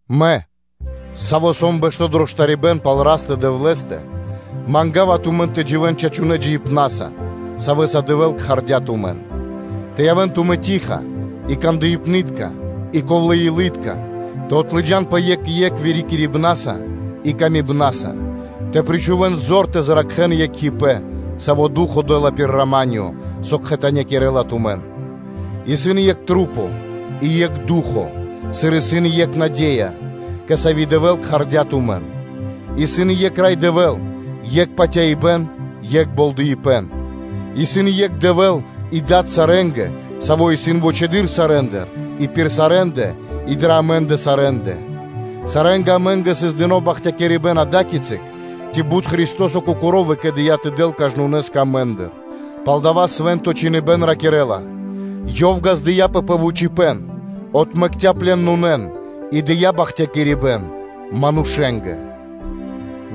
Мэ, саво́ сом пхандло ману́ш пал Растэ – Дэвлэ́стэ, манга́ва тумэн тэ дживэ́н чачунэ́ (мольнонэ́) джиибнаса, савэ́са Дэвэ́л кхардя́ тумэн, тэ явэ́н тумэ́ штыл (тиха) и кандыпны́тка и ковлэ́-илы́тка, тэ отлыджанпэ екх кэ екх длугонэ вырикирибнаса и патыва́са, тэ причхувэ́н зор тэ зракхэн екхипэ́н, саво́ Ду́хо (Фа́но) дэ́ла пир рама́нё (миро), со кхэтанякирэла тумэн. Исын екх маса́ и екх Ду́хо (Фа́но), сыр исын и екх наде́я, кэ сави́ Дэвэ́л кхардя́ тумэн; исын екх Рай Дэвэ́л, екх патяибэ́н, екх болдыипэн. Исын екх Дэвэ́л и Дад сарэ́нгэ, Саво́ исын вучэды́р сарэ́ндыр и пир сарэ́ндэ и дрэ амэ́ндэ сарэ́ндэ. Сарэ́нгэ амэ́нгэ сыс дыно́ бахтякирибэ́н ада́кицы, ци бут Христо́со Кокоро́ выкэдыя́ тэ дэл кажнонэ́скэ амэ́ндыр, палдава́ Свэ́нто Чхиныбэ́н ракирэ́ла: “Ёв ґаздыя́пэ пэ вучыпэн, отмэкця́ пленонэн и дыя́ бахтякирибэ́н манушэ́нгэ”,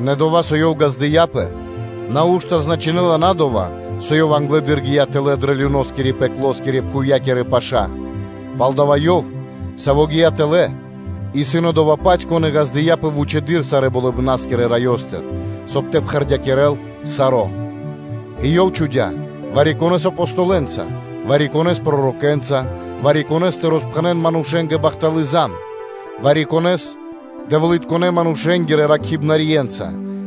нэ дова́, со Ёв “ґаздыя́пэ”, нау́што значынэ́ла на дова́, со Ёв англэды́р гия́ тэлэ́ дрэ люноскирэ (адоскирэ)-пхувья́кирэ паша́. Палдава́ Ёв, Саво́ гия́ тэлэ́, исын Одова́-Паць, Кон и ґаздыя́пэ вучэды́р сарэ́ Болыбна́скирэ Раёстыр, соб (кай) тэ пхэрдякирэл саро́; и Ёв чхудя́ вари-конэ́с Апостолэнца, вари-конэ́с пророкэнца, вари-конэ́с тэ роспхэнэ́н манушэ́нгэ бахталы́ зан, вари-конэ́с Дэвлытконэ́-манушэ́нгирэ ракхибнарье́нца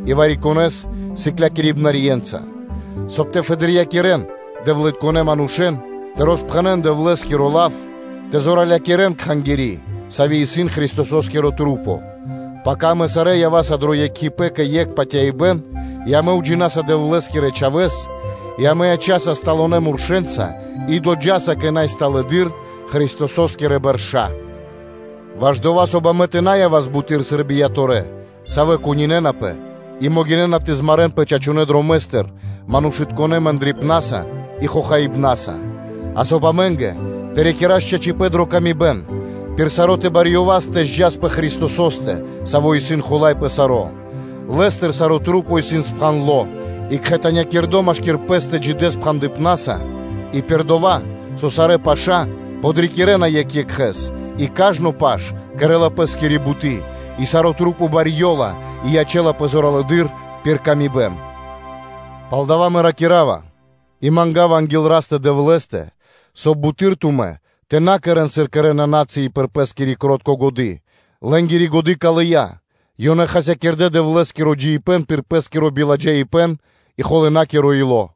и вари-конэ́с сыклякирибнаскирэ́нца, соб (кай) тэ фэдырьякирэн Дэвлытконэ́ манушэ́н тэ роспхэнэ́н Дэвлэ́скиро лав тэ зоралякирэн Кхангири́, Сави́ исын Христосо́скирэ-духо́скирэ маса́; пака амэ сарэ́ ява́са дро екхипэ́н кэ екх патяибэ́н и амэ уджинаса Дэвлэ́скирэ Чхавэ́с, и амэ ячаса барэ́ (стала) мурша и доджаса кэ най сталэдыр (сама стала) Христосо́скирэ бэрша́; ваш дова́, соб (кай) амэ тэ на явас буты́р сыр бияторэ́ (тыкнорэ́), савэ́ кунинэнапэ и могинэ́на тэ змарэнпэ чачунэ́ дромэ́стыр манушытконэ́ мэндрипнаса и хохаибнаса; а соб (кай) амэ́нгэ тэ рикирас чачипэ́н дрэ паты́в екх кэ екх, пир саро́ тэ барьёвас тэ зджас (тэ подджас) пэ Христосо́стэ, Саво́ исын Хула́й пэ саро́: Лэ́стыр сарэ́ Духо́скирэ маса́ (Кхангири́) исын спхандлэ́ и кхэтанякирдэ́ машки́р пэ́стэ джидэ́ спхандыпнаса и пир дова́, со сарэ́ паша́ подрикирэна екх екхэ́с и кажно паш кэрэ́ла пэ́скири буты́, и сарэ́ маса́ барьёна и ячэ́напэ зоралэды́р пир паты́в кэ яви́р мануша́. Палдава́ мэ ракира́ва, и манга́ва анги́л Растэ – Дэвлэ́стэ, соб (кай) буты́р тумэ́ тэ на кэрэ́н, сыр кэрэ́на на́цыи пир пэ́скири кро́тко годы́, лэ́нгири годы́ калыя, ёнэ хасякирдэ́ Дэвлэ́скиро джиибэ́н пир пэ́скиро биладжаипэ́н и холынакиро ило́,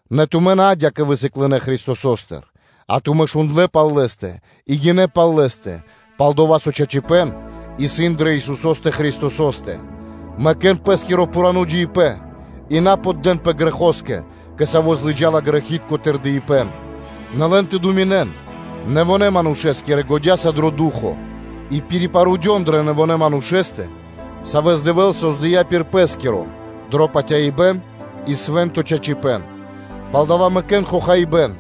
Нэ тумэ́ на адя́кэ высыклынэ Христосостыр, а тумэ́ шундлэ́ пал Лэ́стэ и гинэ́ пал Лэ́стэ, пал-дова́ со чачипэ́н исын дрэ Исусо́стэ Христосо́стэ. Мэкэ́н пэ́скиро пхурано́ джиибэ́н и на поддэнпэ грэхо́скэ, кэ саво́ злыджала грэхи́тко тырдыпэ́н; нэ лэн тэ думинэн нэвонэ́-манушэ́скирэ-годя́са дро Ду́хо (Фа́но); и пирипарудён дрэ нэвонэ́ манушэ́стэ, савэ́с Дэвэ́л создыя́ пир Пэ́скиро дро патяибэ́н и свэ́нто чачипэ́н. Палдава́ мэкэ́н хохаибэ́н,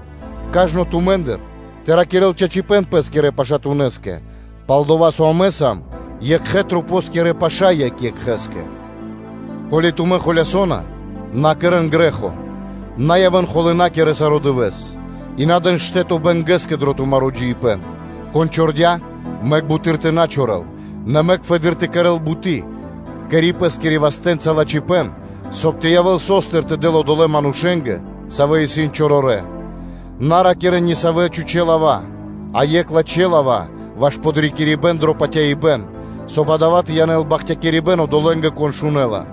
кажно тумэ́ндыр тэ ракирэ́л чачипэ́н пэ́скирэ пашатунэ́скэ, пал-дова́ со амэ сам екхэ́ масэ́нгирэ паша́ екх екхэ́скэ. Ко́ли тумэ́ холясона, на кэрэ́н грэ́хо: на явэ́н холынакирэ саро́ дывэ́с, и на дэн штэ́то бэнгэ́скэ дро тумаро́ джиибэ́н. Кон чордя, мэк буты́р тэ на чорэл, нэ мэк фэды́р тэ кэрэ́л буты́, кэри пэ́скирэ вастэ́нца лачхипэ́н, соб (кай) тэ явэ́л со́стыр тэ дэл одолэ́ манушэ́нгэ, савэ́ исын чорорэ́. На ракирэ́н нисавэ кирнэ лава́, а екх лачхэ́ лава́, ваш подрикирибэ́н дро патяибэ́н, соб (кай) дава́ тэ янэл бахтякирибэ́н одолэ́нгэ, кон шунэ́ла.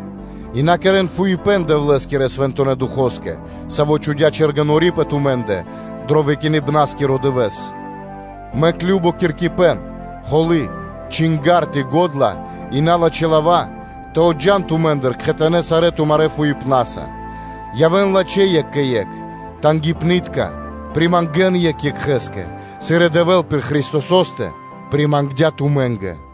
И на кэрэ́н фуипэ́н Дэвлэ́скирэ Свэнтонэ́ Духо́скэ, Саво́ чхудя́ чэргэнори́ пэ тумэ́ндэ дро выкиныбнаскиро дывэ́с. Мэк кажно киркипэн, холы́, чинга́рд, и го́дла и налачхэ́ лава́ тэ отджан тумэ́ндыр кхэтанэ́ сарэ́ тумарэ́ фуипнаса. Явэ́н лачхэ́ екх кэ екх, тангипны́тка (жалосна), примангэн екх екхэ́скэ, сыр и Дэвэ́л пир Христосо́стэ примангдя тумэ́нгэ.